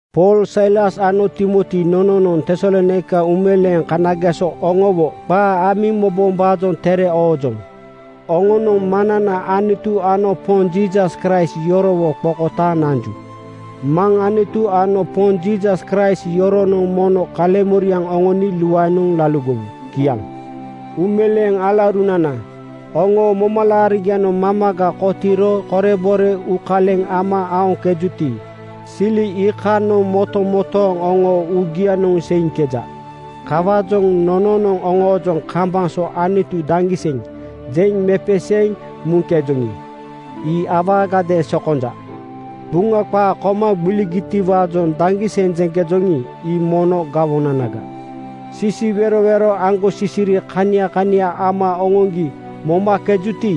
Pool, Sailas ano Timoti nononoŋ Tesalonaika uumeleeŋ kanageso oŋowo qaa amiŋ mobombaajoŋ tere oojoŋ. Oŋonoŋ Maŋnana Anutu ano Poŋ Jiisas Kraist yorowo qokotaaŋ nanju. Maŋ Anutu ano Poŋ Jiisas Kraist yoronoŋ mono kaleŋmoriaŋ oŋoni luaenoŋ laligowu. Kiaŋ. Uumeleeŋ alaurunana, oŋoo momalaarigianoŋ mamaga kotiiro korebore uukaleŋ ama aoŋkejuti, sili iikanoŋ motomotooŋ oŋoo uugianoŋ seiŋkeja. Kawaajoŋ nononoŋ oŋoojoŋ kambaŋ so “Anutu daŋgiseŋ!” jeŋ mepeseeŋ muŋkejoŋi, ii awaagadeeŋ sokonja. Buŋa qaa koma gbiligitiwaajoŋ daŋgiseŋ jeŋkejoŋi, ii mono gawonanaga. Sisiwerowero aŋgosisiri kania kania ama oŋoŋgi momakejuti,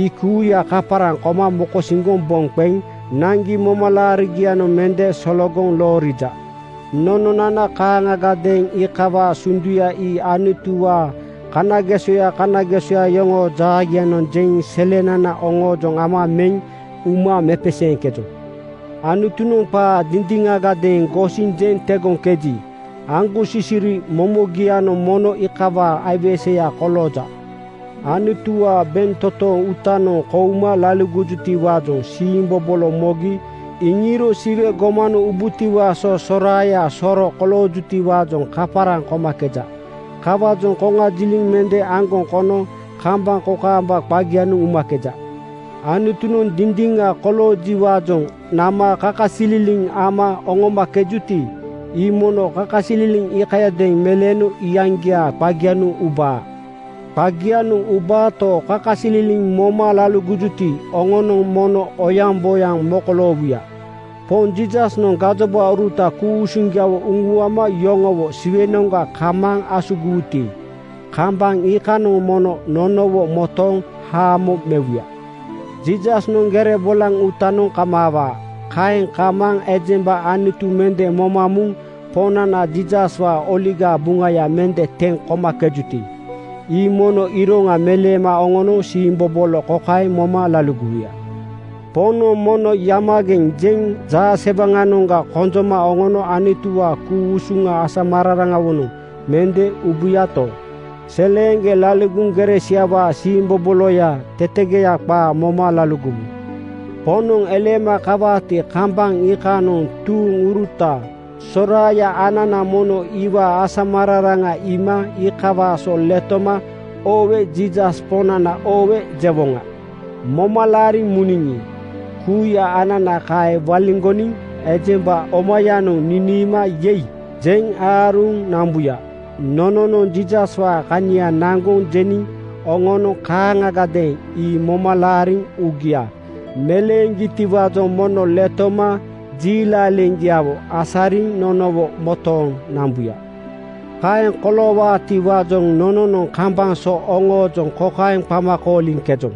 ii kuuya kaparaŋ koma mokosiŋgoŋ boŋ qeŋ naŋgi momalaarigianoŋ mende sologoŋ loorija. Nononana kaaŋagadeeŋ iikawaa sunduya ii Anutuwaa kanagesoya kanagesoya yoŋoo jaagianoŋ jeŋ selenana oŋoojoŋ ama meŋ uma mepeseeŋkejoŋ. Anutunoŋ qaa dindiŋagadeeŋ gosiŋ jeŋ tegoŋkeji, aŋgosisiri momogianoŋ mono iikawaa aiweseya kolooja. Anutuwaa bentotoŋ uutanoŋ kouma laligojutiwaajoŋ siimbobolo mogi iŋiiro Siwe gomanoŋ ubutiwaa so soraaya soro koloowutiwaajoŋ kaparaŋ komakeja. Kawaajoŋ koŋajiliŋ mende aŋgoŋ kono kambaŋ kokaamba qagianoŋ umakeja. Anutunoŋ dindiŋa koloojiwaajoŋ nama kakasililiŋ ama oŋomakejuti, ii mono kakasililiŋ iikayadeeŋ meleeno iyaŋgiaa qagianoŋ ubaa. Qagianoŋ ubaato, kakasililiŋ moma laligojuti, oŋonoŋ mono oyaŋboyaŋ mokoloowuya. Poŋ Jiisasnoŋ gajobauruta ku-usuŋgiawo uŋuama yoŋowo Siwenoŋga kamaaŋ asugiwuti, kambaŋ iikanoŋ mono nonowo motooŋ haamo mewuya. Jiisasnoŋ gere bolaŋ uutanoŋ kamaawaa. Kaeŋ kamaaŋ ejemba Anutu mende moma muŋ Poŋnana Jiisaswaa Oligaa Buŋaya mende teŋ komakejuti, ii mono iroŋa meleema oŋono siimbobolo kokaeŋ moma laligowuya: Poŋnoŋ mono “Yamageŋ (kozigeŋ)!” jeŋ jaasewaŋanoŋga konjoma oŋono Anutuwaa ku-usuŋa asamararaŋawonoŋ mende ubuyato, seleeŋgeŋ laligoŋ gere siawaa siimboboloya tetegoya qaa moma laligowu. Poŋnoŋ eleema kawaati, kambaŋ iikanoŋ tuuŋuruta soraaya anana mono iwaa asamararaŋa iima iikawaa so letoma “Oowe, Jiisas Poŋnana oowe!” jewoŋa. Moma laariŋ muniŋi, kuuya anana kaeŋ waliŋgoniŋ ejemba omayanoŋ niniima “Yei!” jeŋ aaruŋ nambuya. Nononoŋ Jiisaswaa kania naŋgoŋ jeniŋ oŋonoŋ kaaŋagadeeŋ ii moma laariŋ uugia meleeŋgitiwaajoŋ mono letoma jiilaleŋgiawo asariŋ nonowo motooŋ nambuya. Kaeŋ koloowaatiwaajoŋ nononoŋ kambaŋ so oŋoojoŋ kokaeŋ qama kooliŋkejoŋ,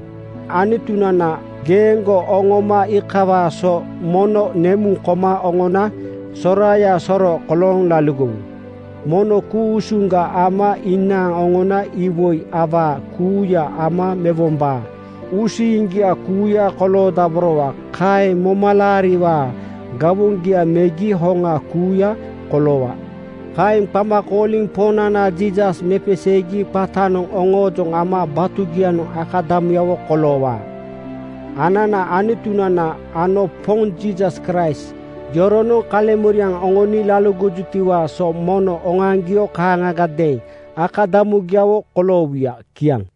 “Anutunana, geeŋgo oŋooma iikawaa so mono nemuŋ koma oŋona soraaya soro kolooŋ laligowu. Mono ku-usuŋga ama inaaŋ oŋona iwoi awaa kuuya ama mewombaa uusiiŋgia kuuya koloodaborowa. Kaeŋ momalaariwaa gawoŋgia megi hoŋa kuuya koloowa.” Kaeŋ qama kooliniŋ Poŋnana Jiisas mepeseegi qatanoŋ oŋoojoŋ ama batugianoŋ akadamuyawo koloowaa. Ananaa Anutunana ano Poŋ Jiisas Kraist yoronoŋ kaleŋmoriaŋ oŋoni laligojutiwaa so mono oŋoaŋgio kaaŋagadeeŋ akadamugiawo koloowuya. Kiaŋ.